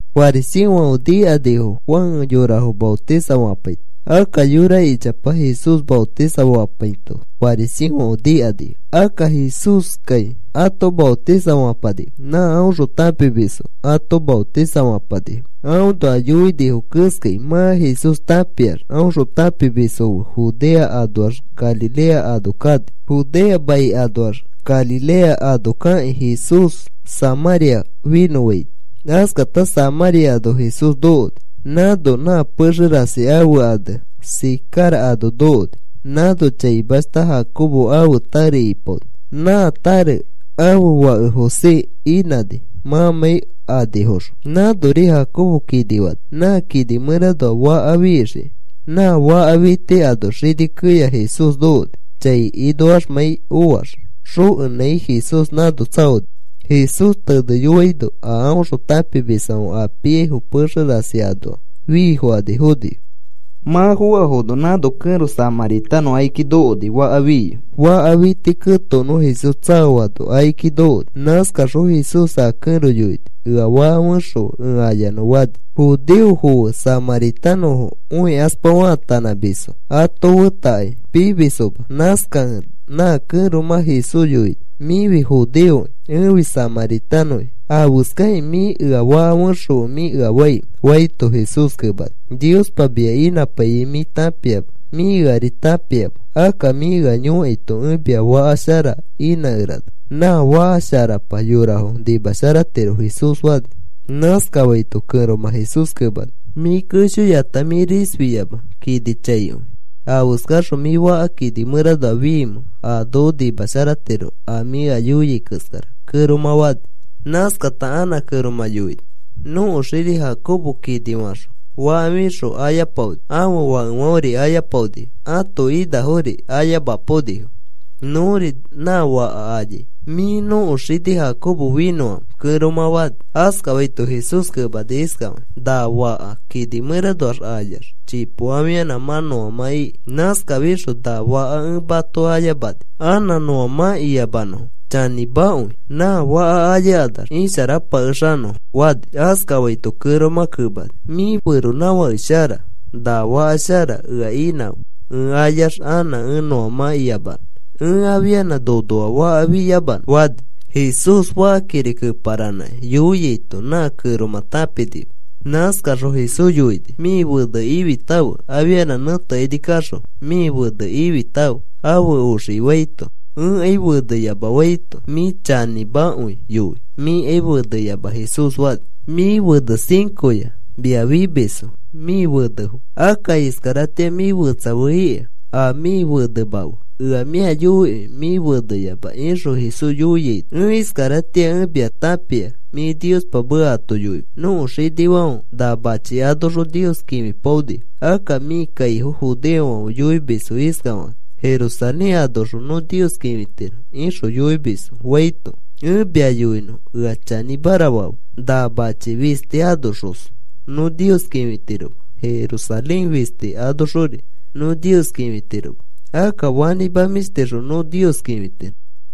Fariseofãfe nikanifo Juan yorafo maotisafapaito. Akka yora ichapa Jesús maotisafapaito fariseofãfe nikanifo. Akka Jesúskai ato maotisafapanima, nã aõxõ tãpimisfãfe ato maotisafapanifo. Aõnoa yoinifo keskai mã Jesús tãpiax aõxõ tãpimisfo fe Judea anoax Galilea ano kani. Judea mai anoax Galilea ano kakĩ Jesús Samãria finõfaini. Askata Samãria ano Jesús nokoni. Nãno nã pexe rasi ãfe ane Sicar ano nokoni. Nãno chaimashta Jacobo ãfe tare ipaoni. Nã tare ãfe fake José inãni mãmãi anifoxõ. Nãnori Jacobo kini fani nã kini mẽranoa faka fixikĩ. Nã faka fiti ano xini keya Jesús nokoni. Chai inoaxmãi oax xokenãi Jesús nãno tsaoni. Jesús teneyoaino, a aõxõ tãpimisfãfe a piaifo pexe rasi anoa fiifokani fonifo. Mã foafono nãno kẽro samãritanõ akiki nokoni faka fiyoi. Faka fiti ketokonõ Jesús tsaoano akiki nokoni. Nãskaxõ Jesús a kẽro yoini: “Ea faka fexõfe ẽ ayanõ,” fani. Judeofo fe samãritanõfo õikaspa faatanãmisfo. Ato fetakai pimisfoma. Nãskakẽ nã kẽromã Jesús yoini: “Mĩfi judeoki. Ẽfi samãritanõki. ¿Afeskakĩ mĩ, ‘Ea faka fexõfe,’ mĩ ea faimẽ?” faito, Jesús kemani: “Niospa mia inãpaiyai mĩ tãpiama mĩ eari tãpiama. Akka mĩ ea yõkaito ẽ mia faka shara inãkerana. Nã faka sharapa yorafo nimasharatiro,” Jesús fani. Nãskafaito kẽromã Jesús kemani: “Mĩ keshoyata mĩ risfi yama. Kini chaikõi, ¿afeskafaxõ mĩ faka kini mẽranoa fiimẽ a noko nimasharatiro a mĩ ea yoiai keskara?” kẽromã fani. Nãskata anã kẽromã yoini: “Nõko xini Jacobo kini faxõ faka fixõ ayapaoni. Ãfe fakefãferi ayapaonifo. Ãto inafori ayamapaonifo. Nõri nã faka ayai. ¿Mĩ nõko xini Jacobo finõamẽ?” kẽromã fani. Askafaito Jesús kemani iskafakĩ: “Na faka kini mẽranoa ayax chipo afianã mã nõamã iki. Nãskafixõ na faka ẽ ato ayamani anã nõamãkiyamanõfo. Chanĩmakõi, nã faka ayakanax isharapakexanõfo,” fani. Askafaito kẽromã kemani: “Mĩ feronãfake shara. Na faka shara ea inãfe ẽ ayax anã ẽ nõamãkiyamanõ ẽ afianã nonoa faka fiyamanõ,” fani. (Jesús fakakiri keparanãkĩ yoiaito nã kẽromã tãpinima.) Nãskaxõ Jesús yoini: “Mĩ fene ifitãfe afianã nẽtekaini kaxõ mĩ fene ifitãfe afe oxikĩ,” faito, “Ẽkai feneyama,” faito, “Mĩ chanĩmakõi yoi. Mĩkai feneyama,” Jesús fani. “Mĩ fene cincoya mia fimisfo mĩ fenefo. Akka iskaratĩa mĩ fetsa fe ika a mĩ fenema fe. Ea mĩa yoikõi mĩ feneyama,” ixõ Jesús yoiaino, “Ẽ iskaratĩa ẽ mia tãpia mĩ Niospa meka ato yoimis. Nõko xinifãfe na machi anoxõ Nios kĩfipaonifo. Akka mĩ kaifo judeofãfe yoimisfo iskakakĩ: ‘Jerusalén anoxõ nõ Nios kĩfitiro,’ ixõ yoimisfo,” faito, “Ẽ mia yoinõ, ea chanĩmara fafe. Na machi fisti anoxos nõ Nios kĩfitiroma. Jerusalén fisti anoxori nõ Nios kĩfitiroma. Akka fanĩma mĩshtixõ nõ Nios kĩfitiro.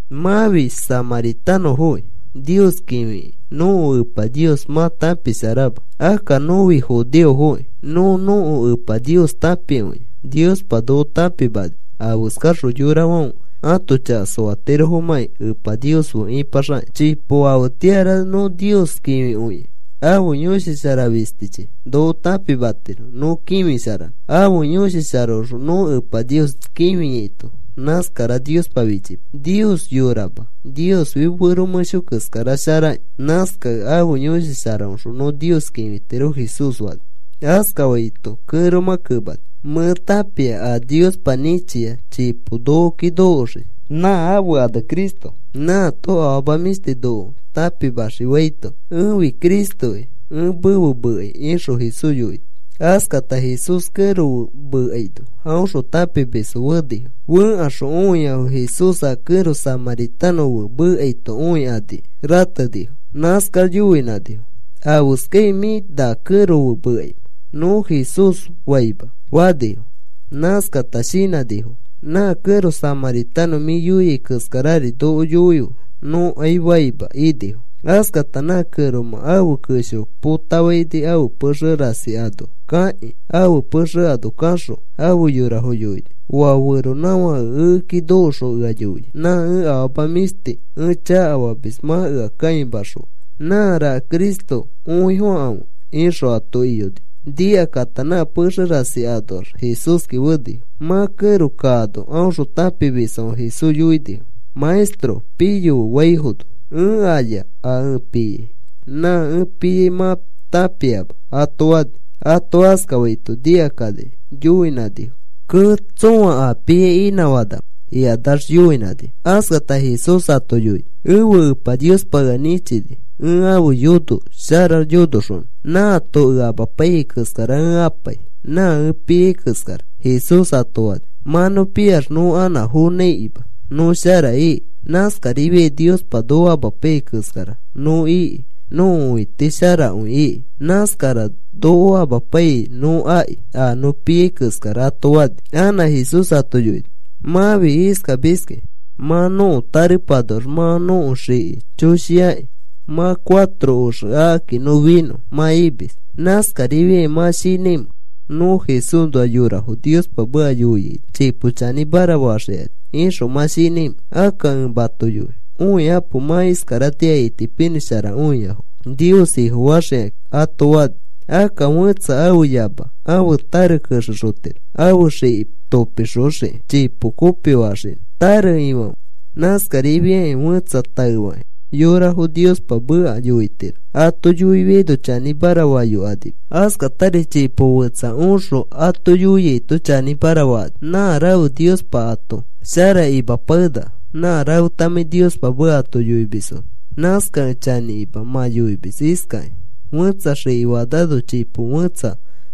Mãfi samãritanõfoki. Nios kĩfifikĩ nõko Epa Nios mã tãpisharama. Akka nõfi judeofoki. Nõ nõko Epa Nios tãpikõia. Niospa noko tãpimani afeskaxõ yorafãfe ãto chaka soatirofomãki Epa Nios fe ipaxakakĩ. Chipo afetĩara nõ Nios kĩfikõikẽ, ãfe Yõshi Shara fistichi noko tãpimatiro nõ kĩfisharanõ. Ãfe Yõshi Sharaõxõ nõ Epa Nios kĩfikõiaito nãskara Niospa fichipai. Nios yorama. Niosfi fero mẽsho keskara sharaki. Nãskakẽ ãfe Yõshi Sharaõxõ nõ Nios kĩfitiro,” Jesús fani. Askafaito kẽromã kemani: “Mẽ tãpia a Niospa nĩchia chipo nokoki nokoxii. Nã ãfe ane Cristo. Nãato afama mĩshti noko tãpimaxii,” faito, “Ẽfi Cristoki, ẽ mefe mekai,” ixõ Jesús yoini. Askata Jesús kẽro fe mekaino aõxõ tãpimisfo fenifo. Fẽkaxõ õiafo Jesús a kẽro samãritanõ fe mekaito õikani ratenifo. Nãskax yoinãnifo: “ ‘¿Afeskai mĩ na kẽro fe mekaimẽ?’ nõ Jesús faima,” fanifo. Nãskata shinãnifo: “Nã kẽro samãritanõ mĩ yoia keskarari nokori yoife, nõkai faima,” inifo. Askata nã kẽromã ãfe kesho potafaini ãfe pexe rasi ano kakĩ. Ãfe pexe ano kaxõ ãfe yorafo yoini: “Oa feronãfake ekeki nokoxõ ea yoia. Nã ẽ afama mĩshti ẽ chakafamis mã ea kãimaxõa. Nãraka Cristo, õifokãfe,” ixõ ato iyoni. Nikakata nã pexe rasi anoax Jesúski fenifo. Mã kẽro kaano aõxõ tãpimisfãfe Jesús yoinifo: “Maestro, piyofe,” faifono, “Ẽ aya a ẽ piai. Nã ẽ piai mã tãpiama,” ato fani. Ato askafaito nikakani yoinãnifo: “Kee. ¿Tsõa a piai inãfanamẽ?” ikanax yoinãnifo. Askata Jesús ato yoini: “Ẽfe Epa Niospa ea nĩchini ẽ ãfe yono shara yonoxonõ. Nãato ea amapaiyai keskara ẽ apai. Nã ẽ piai keskara,” Jesús ato fani. (“Mã nõ piax nõ anã fonãikima, nõ shara iki. Nãskarifiai Niospa noko amapaiyai keskara nõ iki nõko õiti sharakõi iki. Nãskara noko amapaiyai nõ aki, a nõ piai keskara,” ato fani.) Anã Jesús ato yoini: “Mãfi iskamiski: ‘Mã nõko tarepanoax mã nõko xiki choshiaki. Mã cuatro oxe akaki nõ finõ,’ mã imis. ¿Nãskarifiakĩ mã shinãimẽ: ‘Nõ Jesúsnoa yorafo Niospa meka yoiano chipo chanĩmara faxikani,’ ixõ mã shinãimẽ? Akka ẽ mato yoi: ‘Õikapo, mã iskaratĩa itipinĩsharakõiafo Nios Ifofaxikakĩ,’ ato fani. Akka fẽtsa ãfe yama ãfe tare kexexotiro, ãfe xiki topixoxiki. Chipo kopifaxinõ, tare ifãfe. Nãskarifiakĩ fẽtsa taefakĩ yorafo Niospa meka yoitiro. Ato yoifiaino chanĩmara fayokanima. Askatari chipo fetsa oxõ ato yoiaito chanĩmara fakani. Nã rafe Niospa ato shara imapakenaka nã rafetamãi Niospa meka ato yoimisfono. Nãskakẽ chanĩkima mã yoimis iskakĩ: ‘Fẽtsa xiki fanano chipo fẽtsa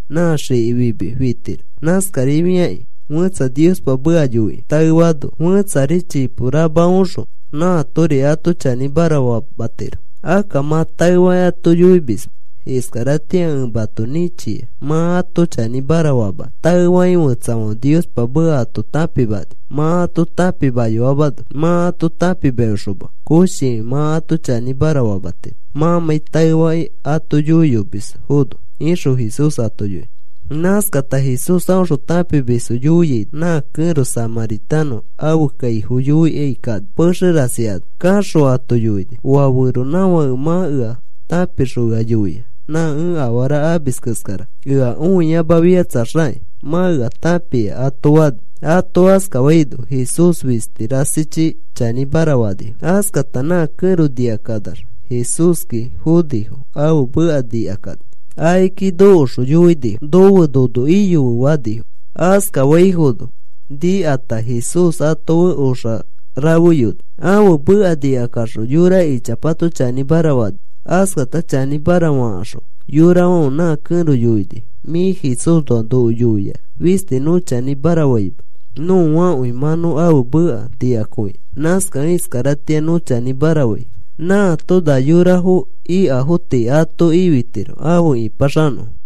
nã xiki fimi fitiro.’ Nãskarifiakĩ fẽtsa Niospa meka yoikĩ taefaano fẽtsari chipo rama oxõ nãatori ato chanĩmara famatiro. Akka mã taefakĩ ato yoimisma iskaratĩa ẽ mato nĩchia mã ato chanĩmara famanõ. Taefakĩ fetsafãfe Niospa meka ato tãpimani, mã ato tãpimayoamano. Mã ato tãpimayoxoma koshikõi mã ato chanĩmara famatiro mãmãi taefakĩ ato yoiyomisfono,” ixõ Jesús ato yoini. Nãskata Jesús aõxõ tãpimisfo yoiaino nã kẽro samãritanõ ãfe kaifo yoikai kani pexe rasi ano. Kaxõ ato yoini: “Oa feronãfãke mã ea tãpixõ ea yoia nã ẽ afara amis keskara. Ea õiyamafikatsaxakĩ mã ea tãpia,” ato fani. Ato askafaino Jesús fisti rasichi chanĩmara fanifo. Askata nã kẽro nikakanax Jesúski fonifo ãfe meka nikakani. Akiki nokoxõ yoinifo: “Nofe nono iyofe,” fanifo. Askafaifono nikata Jesús ato fe oxa rafeyoni. Ãfe meka nikakaxõ yora ichapato chanĩmara fanifo. Askata chanĩmara fakaxõ yorafãfe nã kẽro yoinifo: “Mĩ Jesúsnoa noko yoia fisti nõ chanĩmara faima. Nõakõi mã nõ ãfe meka nikakõia. Nãskakẽ iskaratĩa nõ chanĩmara fai. Nãato na yorafo ikafo tii ato ifitiro afe ĩpaxanõfo.”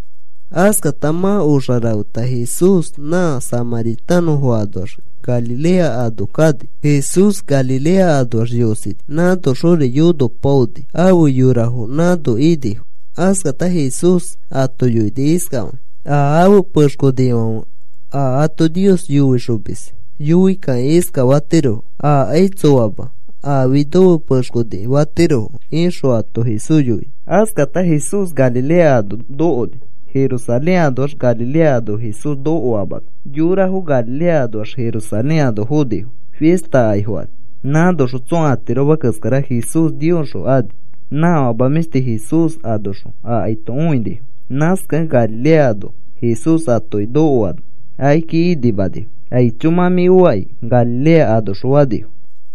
Askata mã oxa rafeta Jesús nã samãritanõfo anoax Galilea ano kani. Jesús Galilea anoax yosini, nãnoxori yonopaoni. Afe yorafo nãno inifo. Askata Jesús ato yoini iskafakĩ: “A afe pexkonifãfe a ato Nios yoixomis yoikakĩ iskafatirofo: ‘Akai tsoama, afi nofe pexkoniki,’ fatirofo,” ixõ ato Jesús yoini. Askata Jesús Galilea ano nokoni. Jerusalén anoax Galilea ano Jesús nokoamano yorafo Galilea anoax Jerusalén ano fonifo fista aki fokani. Nãnoxõ tsõa atiroma keskara Jesús Niosxõ ani. Nã afama mĩshti Jesús anoxõ akaito õinifo. Nãskakẽ Galilea ano Jesús atoki nokoano akiki inimanifo: “Aicho, mã mĩ oaki,” Galilea anoxõ fanifo.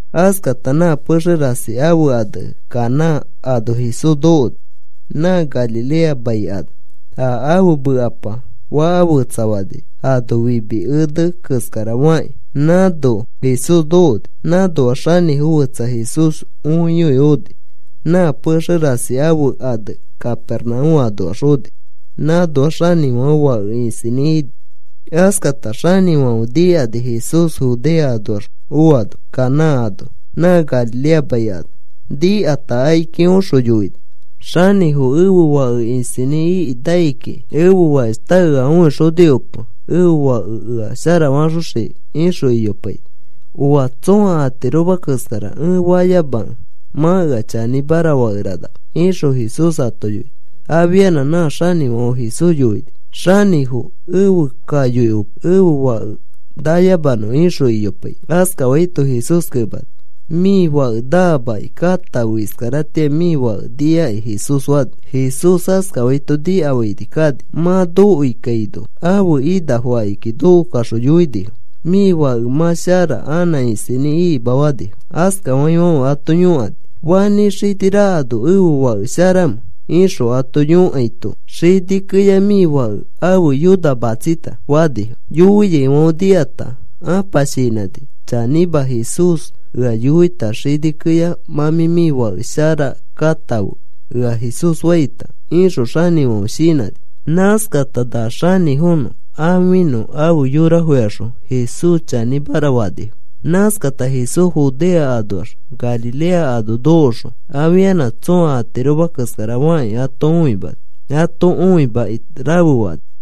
Askata nã pexe rasi ãfe ane Caná ano Jesús nokoni nã Galilea mai ano. A ãfe mekapa faka fetsafani ano fimi ene keskara fakĩ nãno Jesús nokoni. Nãnoa xanĩfo fẽtsa Jesús õiyoi oni. Nã pexe rasi ãfe ane Capernaúm anoax oni. Nãnoax xanĩfãfe fake isinĩ ini. Askata xanĩfãfe nikani Jesús Judea anoax oano Caná ano nã Galilea mai ano. Nikata akiki oxõ yoini: “Xanĩfo, ẽfe fake isinĩ iki nai kiki. Ẽfe fakeshta ea õixoni ope ẽfe fake ea sharafaxoxikĩ,” ixõ iyopaini. “¡Ooa! Tsõa atiroma keskara ẽ fayamakẽ mã ea chanĩmara fakeranama,” ixõ Jesús ato yoini. Afianã nã xanĩfãfe Jesús yoini: “Xanĩfo, efe kayoikape ẽfe fake nayamanõ,” ixõ iyopaini. Askafaito Jesús kemani: “Mĩ fake namaki. Katãfe. Iskaratĩa mĩ fake niaki,” Jesús fani. Jesús askafaito nikafaini kani. Mã nokoi kaino ãfe inafo akiki nokokaxõ yoinifo: “Mĩ fake mã shara, anã isinĩ ikima,” fanifo. Askafaifãfe ato yõkani: “¿Fanĩ xini rakano ẽfe fake sharamẽ?” ixõ ato yõkaito, “Xini keya mĩ fake ãfe yona matsita,” fanifo. Yoiaifãfe nikata ãpa shinãni: “Chanĩma, Jesús ea yoita xini keya, ‘Mã mĩ fake sharaki katãfe,’ ea Jesús faita,” ixõ xanĩfãfe shinãni. Nãskata na xanĩfonõ ãfinõ afe yorafoyaxõ Jesús chanĩmara fanifo. Nãskata Jesús Judea anoax Galilea ano nokoxõ afianã tsõa atiroma keskara fakĩ ato õimani. Ato õimakĩ rafe fani.